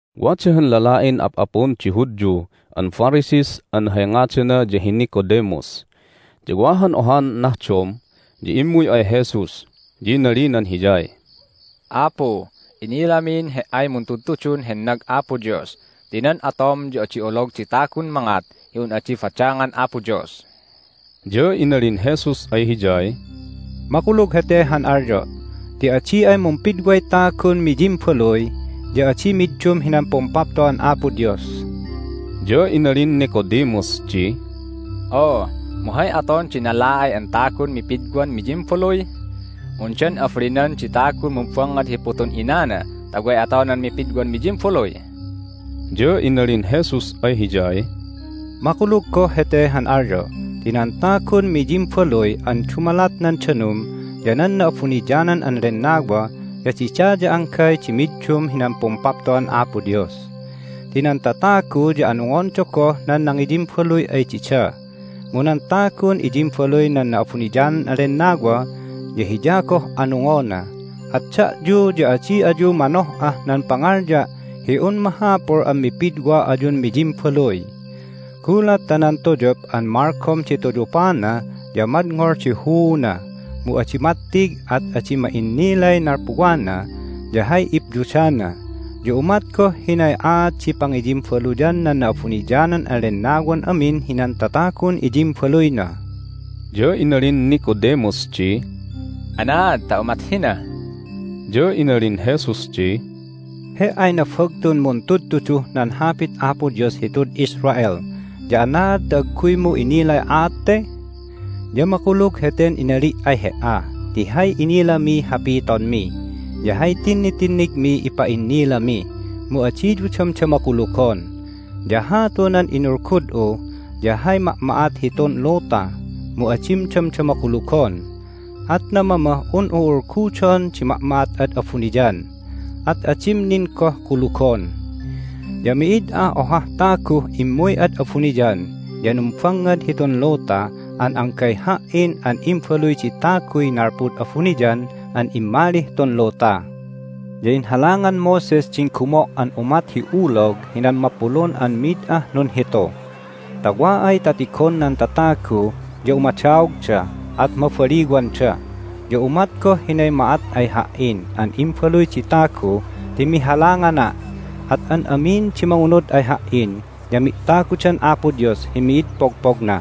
Wada han lala'in ap'apun di Hudyu an Pharisees an hay ngadana ya hi Nicodemus. Ya wa han ohan nahdom ya immuy ay Jesus, ya inalinan Hiyay, "Apu, inilamin He"ay muntudtudun hennag Apo Dios ti nan atom ya adi olog di tagun mangat hi un adi badangan Apo Dios." Ya inalin Jesus ay hiyay, "Makulug hete han alyo' ti adi ay mumpidway tagun miyimbaluy ya adi middum hinan Pumpapto'an Apo Dios." Ya inalin Nicodemus di, "Oo, mu hay aton di nala'ay an tagun mipidwan miyimbaluy? Undan abalinan di tagun mumbangngad hi putun inana ta way atonan mipidwan miyimbaluy?" Ya inalin Jesus ay hiyay, "Makulug goh hete han alyo' ti nan tagun miyimbaluy an dumalat nan danum ya nan Na'abuniyanan an Lennawa ya dida ya anggay di middum hinan Pumpapto'an Apo Dios. Ti nan tatagu ya anungonda goh nan nangiyimbaluy ay dida, mu nan tagun iyimbaluy nan Na'abuniyanan an Lennawa ya hiya goh anungona. At da'yu ya adi ayu manoh'ah nan pangalya' hi un mahapul an mipidwa ayun miyimbaluy. Gulat ta nan tuyup an malgom di tuyupana ya madngol di huuna, mu adi mattig, at adi ma'innilay nalpuwana ya hay ipyudana. Ya umat goh hinay aat di pangiyimbaluyan nan Na'abuniyanan an Lennawan amin hinan tatagun iyimbaluyna." Ya inalin Nicodemus di, "Anaad ta umat hina?" Ya inalin Jesus di, "He"ay nabagtun muntudtuduh nan Hapit Apo Dios hitud Israel ya anaad ta agguymu innilay aat te?! Ya makulug heten inali' ay he"a ti hay inilamiy hapitonmi, ya hay tinnitinnigmiy ipa'innilami, mu adiyu damdama kulugon. Ya hatu nan inulgud'u ya hay ma'ma'at hitun luta, mu adim damdama kulugon, at namamah un'u ulgudon di ma'ma'at ad abuniyan, at adim nin goh kulugon! Ya mi'id ah ohah taguh immuy ad abuniyan ya numbangngad hitun luta an anggay Ha"in an Imbaluy di Taguy nalpud abuniyan an immalih tun luta. Ya inhalangan Moses din gumo' an umat hi ulog hinan mapulun an mid ah nunhitu, ta wa ay ta tigon nan tatagu ya umadaogda, at mabaliwanda. Ya umat goh hinay ma'at ay Ha"in an Imbaluy di Tagu ti mihalangana'. At an amin di mangunud ay Ha"in ya mi'tagudan Apo Dios hi mid pogpogna.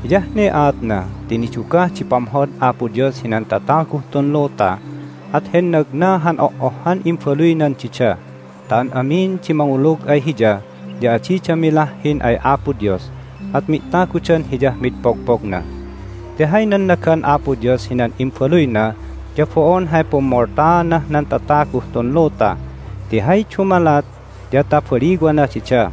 Hiyah ne aatna ti nidugah di pamhod Apo Dios hinan tataguh tun luta, at hennagna han oh'ohhan imbaluynan dida, ta an amin di mangulug ay Hiya ya adida milahhin ay Apo Dios, at mi'tagudan Hiyah mid pogpogna. Ti hay nannagan Apo Dios hinan Imbaluyna ya bo'on hay pummoltaanah nan tataguh tun luta, ti hay dumalat ya ta baliwana dida.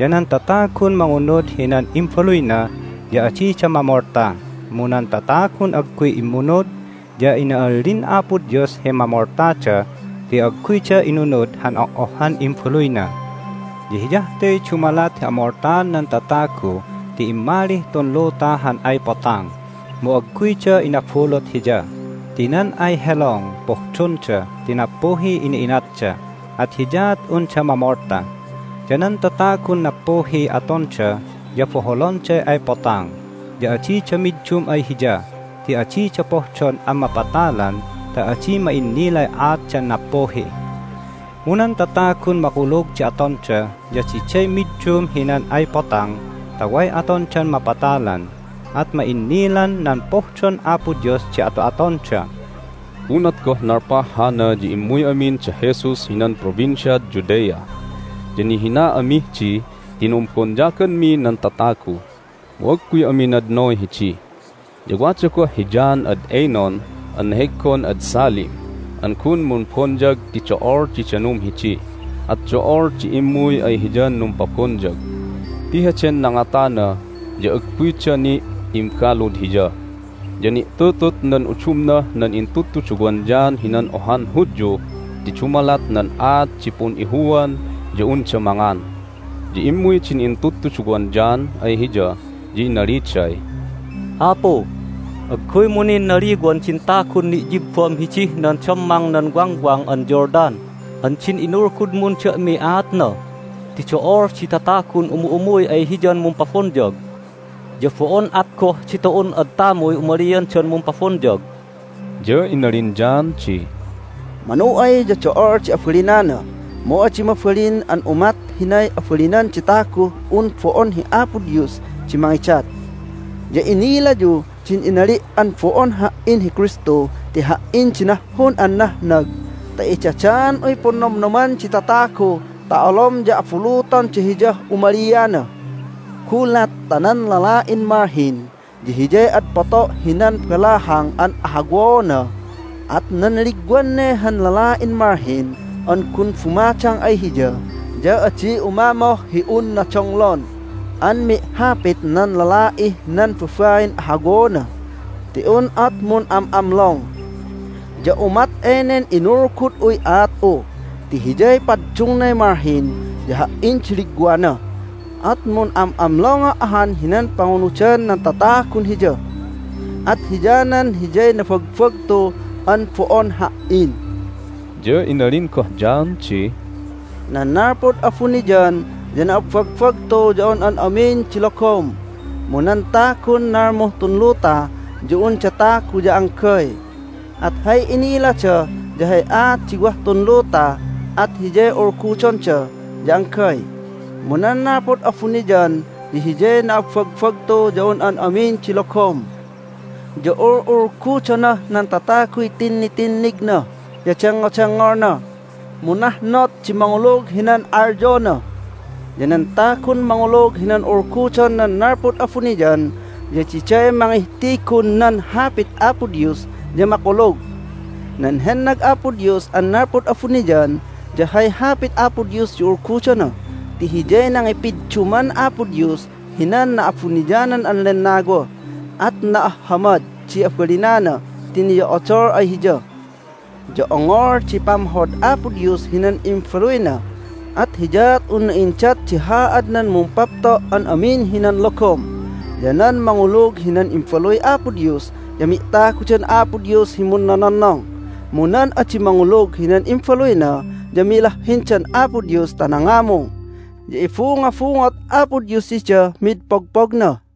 Ya nan tatagun mangunud hinan Imbaluyna ya adida mamolta, mu nan tatagun agguy immunud ya ina'allin Apo Dios hi mamoltada ti agguyda inunud han oh'ohhan Imbaluyna. Ya hiyah te dumalat hi amoltaan nan tatagu ti immalih tun luta han ay Potang, mu agguyda inabulut Hiya, ti nan ay helong pohdonda ti nappuhiy ina'inatda, at hiyaat unda mamolta. Ya nan tatagun nappuhiy atonda ya boholonday ay Potang, ya adida middum ay Hiya ti adida pohdon an mapatalan ta adi ma'innilay aatdan nappuhi. Mu nan tatagun makulug di atonda ya diday middum hinan ay Potang ta way atondan mapatalan, at ma'innilan nan pohdon Apo Dios di ato'atonda." Unat goh nalpah hana ya immuy amin da Jesus hinan Provinciad Judea. Ya nihina amih di ti numbonyaganmi nan tatagu, mu agguy ami nadnoy hidi. Ya wada goh hi John ad Aenon an neheggon ad Salim an gun mumbonyag ti do'ol di danum hidi, at do'ol di immuy ay hiyan numpabonyag ti heden nangatana ya agguyda ni' imbalud hiya. Ya ni'tutut nan udumnah nan intudtuduwan John hinan ohan Hudyu ti dumalat nan aat di pun'ihuan ya unda mangan. Ya immuy din intudtuduwan John ay hiya, ya inaliday, "Apu, agguymu nin naliwan din tagun ni'yibbam hidih nan dammang nan Wangwang an Jordan an din inulgudmun da'miy aatna ti do'ol di tatagun umu'umuy ay Hiyan mumpabonyag. Ya bo'on at goh ditu'un ad tamuy umaliandan mumpabonyag!" Ya inalin John di, "Manu ay ya do'ol di abalinana, mu adi mabalin an umat hinay abalinan di taguh un bo'on hi Apo Dios di mangidat. Ya inilayu din inali' an bo'on ha"in hi Kristu ti ha"in di nahhun an nahnag ta idadaan'uy punnomnoman di tatagu ta olom ya abulutonda Hiyah umaliana. Gulat ta nan lala'in malhin ya hiyay ad poto' hinan balahang an ahawaona, at nan ligwan ne han lala'in malhin an gun bumadang ay hiya ya adi umamoh hi unna donglon an mi'hapit nan lala'ih nan babain ahawaona ti un at mun'am'amlong. Ya umat enen inulgud'uy aat'u ti Hiyay paddungnay malhin, ya ha"in di ligwana, at mun'am'amlonga' ahan hinan pangunudan nan tatagun Hiya. At hiyanan Hiyay nabagbagtu an bo'on ha"in." Ya inalin goh John di, "Nan nalpud abuniyan ya na'abbagbagtu ya un an amin di logom, mu nan tagun nalmuh tun luta ya unda tagu ya anggay, at hay inilada ya hay aat di wah tun luta, at Hiyay ulgudonda ya anggay. Mu nan nalpud abuniyan ya Hiyay na'abbagbagtu ya un an amin di logom. Ya ul'ulgudonah nan tataguy tinnitinnigna ya dengngodengngolna, mu nahnot di mangulug hinan alyona. Ya nan tagun mangulug hinan ulgudon nan nalpud abuniyan ya diday mangihtigun nan Hapit Apo Dios ya makulug. Nan hennag Apo Dios an nalpud abuniyan ya hay Hapit Apo Dios di ulgudona ti Hiyay nangipidduman Apo Dios hinan Na'abuniyanan an Lennawa, at na'ahhamad di abalinana ti niyo'odol ay Hiya. Ya ongol di pamhod Apo Dios hinan Imbaluyna, at hiyaat unna indat di haadnan mumpapto' an amin hinan logom. Ya nan mangulug hinan Imbaluy Apo Dios ya mi'tagudan Apo Dios hi munnononnong, mu nan adi mangulug hinan Imbaluyna ya milahhindan Apo Dios ta nangamung, ya ibungobungot Apo Dios didah mid pogpogna."